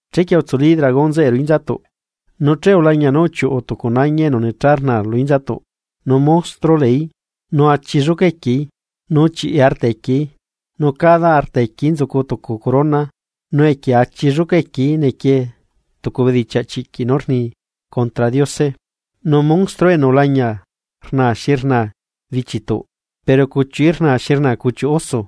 Chequie utsuli dragón zeꞌe ruꞌu inzatuꞌ, nu che ulañia nú uchiuꞌu tucu nañi enu necha rnaa lu inzatuꞌ, nu monstruo leeí nu achi lluca equieí, nu chiꞌi arta equieí nu cada arta equieí nzucu tucu corona, nu equie achi lluca equieí nequie tucu bedichiaꞌ chiꞌquiꞌ nú rni contra Diose. Nu monstruo enu ulañia rnaa xi rnaa bichituꞌ, pero cuchiuꞌí rnaa xi rnaa cuchiuꞌ oso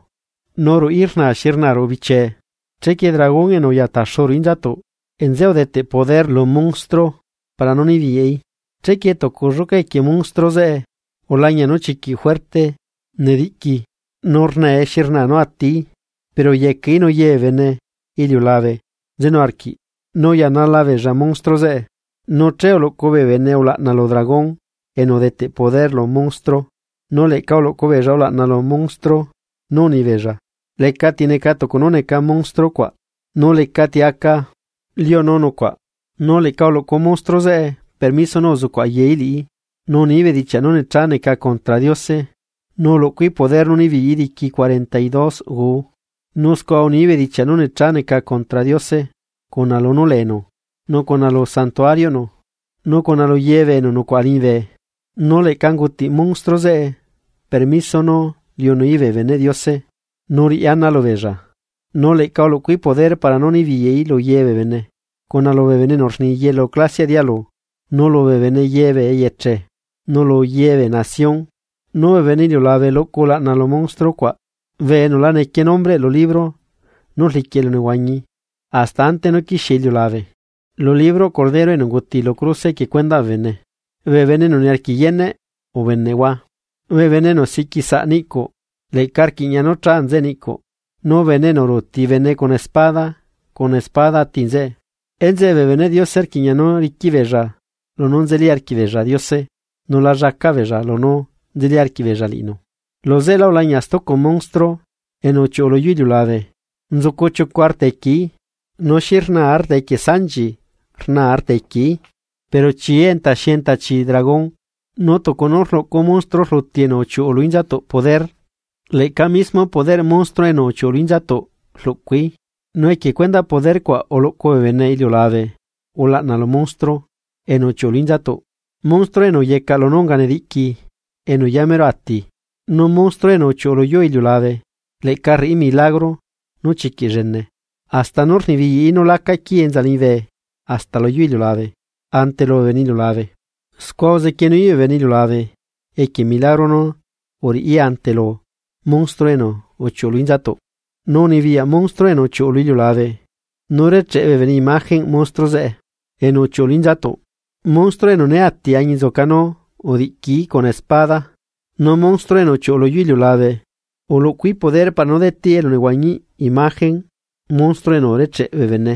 nu ruꞌí rnaa xi rnaa ruꞌu bichiee. Chequie dragón enu uya taxu ruꞌu inzatuꞌ, nzeꞌe udeteꞌ poder lu monstruo para nú nibiyaꞌí. Chequie tucu lluca equie monstruo zeꞌe ulañia nú chiquiꞌ fuerte nediꞌqui nu rnae xi rna nu atií, pero uyecaꞌí nu ye bee bene iliulabe nzenu arquiꞌ, nu uyanala beella monstruo zeꞌe. Nu che uluꞌcu bee bene ulaꞌna lu dragón enu udeteꞌ poder lu monstruo, nu leꞌca uluꞌcu beella ulaꞌna lu monstruo, nu unibeella: ―¿Lecati neca tucu nú neca monstruo cuaꞌ, nu lecati aca liunu nucuaꞌ? Nu leꞌca uluꞌcu monstruo zeꞌe permiso nú uzucuꞌ ayaí liꞌí, nu unií bedichiaꞌ nú necha neca contra Diose. Nu uluꞌcuí poder nú unibiyaꞌí diqui cuarenta y dos guu. Nu scua unií bedichiaꞌ nú necha neca contra Diose, cuna lunú leenu nu cuna lu Santuarioꞌnu, nu cuna luye bee enu nucuaꞌa liñibe. Nu leꞌca ungutiꞌ monstruo zeꞌe permiso nú liunuí bee beneꞌ Diose nu riꞌi ana lubeella. Nu leꞌca uluꞌcuí poder para nú nibiyaí lu yebee bene, cuna lubee bene enu rni yelu clasiaꞌ dialu, nu lubee bene ye bee eyeche, nu lu yebee nación. Nu bee bene iliulabe luꞌcu ulaꞌna lu monstruo cuaꞌ bee enu la nequie nombreꞌ lu libro nú rliquiꞌ elunehuañi hasta ante nú quixie iliulabe, lu libroꞌ Cordero enu unguti lu cruse, equie cuendaꞌ bee bene. Bee bene enu niarquiꞌ yeneꞌ, ubeneꞌhua. Bee bene enu siꞌquisaꞌ niꞌcuꞌ leꞌca rquiꞌña nú cha nzeꞌe niꞌcuꞌ, nu bene enu ruuti bene cuna espada cuna espada ati nzeꞌe. Enzeꞌe bee beneꞌ Diose rquiꞌña nú riquiꞌ beella lunú nzeli arquiꞌ beella Diose, nu la llacaꞌ beella lunú nzeli arquiꞌ beella liꞌinu. Luzeꞌelá ulañia stucu monstruo enu uchiuꞌu lu yuu iliulabe. Nzucu chiucu arta equieí nu xi rna arta equie sanchi rna arta equieí pero chií enta xi enta chi dragón Nu tucu nú rluꞌcu monstruo rluti enu uchiuꞌu lu inzatuꞌ poder, leꞌca mismo poderꞌ monstruo enu uchiuꞌu lu inzatuꞌ rluꞌcuí, nu equie cuendaꞌ poder cuaꞌ uluꞌcu bee bene iliulabe ulaꞌna lu monstro enu uchiuꞌu lu inzatuꞌ, monstruo enu uyecaꞌ lunú unganediꞌqui enu yamero ati. Nu monstruo enu uchiuꞌu luyuu iliulabe leꞌca rriꞌi milagro nú chiquiꞌ llene, hasta nú rnibiyaꞌí nú laca quii enza liñibe hasta luyuu iliulabe ante lubee bene iliulabe. Scua uzequienuí bee bene iliulabe equie milagro nú uriꞌí ante lu monstruo enu uchiuꞌu lu inzatuꞌ, nu unibiyaꞌ monstruo enu uchiuꞌu lu iliulabe nú recheꞌ bee bene imagenꞌ monstruo zeꞌe enu uchiuꞌu lu inzatuꞌ, monstruo enu né ati añinzuca nú udiꞌquií cuna espada. Nu monstruo enu uchiuꞌu luyuu iliulabe uluꞌcuí poder para nú deteꞌí elunehuañiꞌ imagenꞌ monstruo enu urecheꞌ bee bene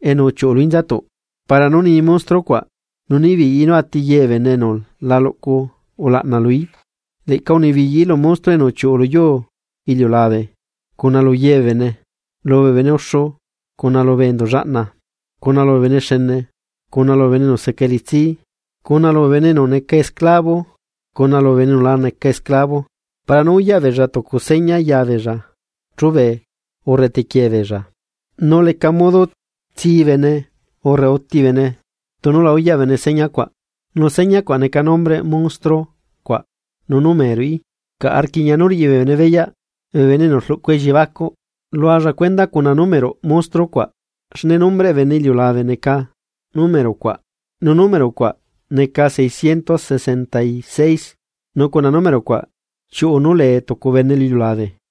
enu uchiuꞌu lu inzatuꞌ, para nú nii monstruo cuaꞌ nu nibiyaꞌí nú ati ye bee enu la luꞌcu ulaꞌna luí. Leꞌca unibiyaꞌí lu monstruo enu uchiuꞌu luyuu iliulabe cuna lu ye bee bene, lubee bene uxu, cuna lubee enduꞌ llaꞌna, cuna lubee bene xene, cuna lubee bene enu seca elitsi, cuna lubee bene enu laca esclavo para nú uyaꞌ beella tucu seña ya beella chube urre tequie beella. Nu leca modo tsi bene urre uti bene tunu la uyaꞌ bene señacuaꞌ, nu señacuaꞌ neca nombreꞌ monstruo cuaꞌ nu númeroꞌí. Caꞌa rquiꞌña nú riꞌi bee bene beyaꞌ, bee bene enu rluꞌcu elliebacuꞌ, lualla cuenda cuna númeroꞌ monstruo cuaꞌ, xne nombreꞌ bene iliulabe neca número cuaꞌ, nu número cuaꞌ neca seicientos sesenta y seis nu cuna número cuaꞌ chiuꞌu nú lee tucu bene lu iliulabe.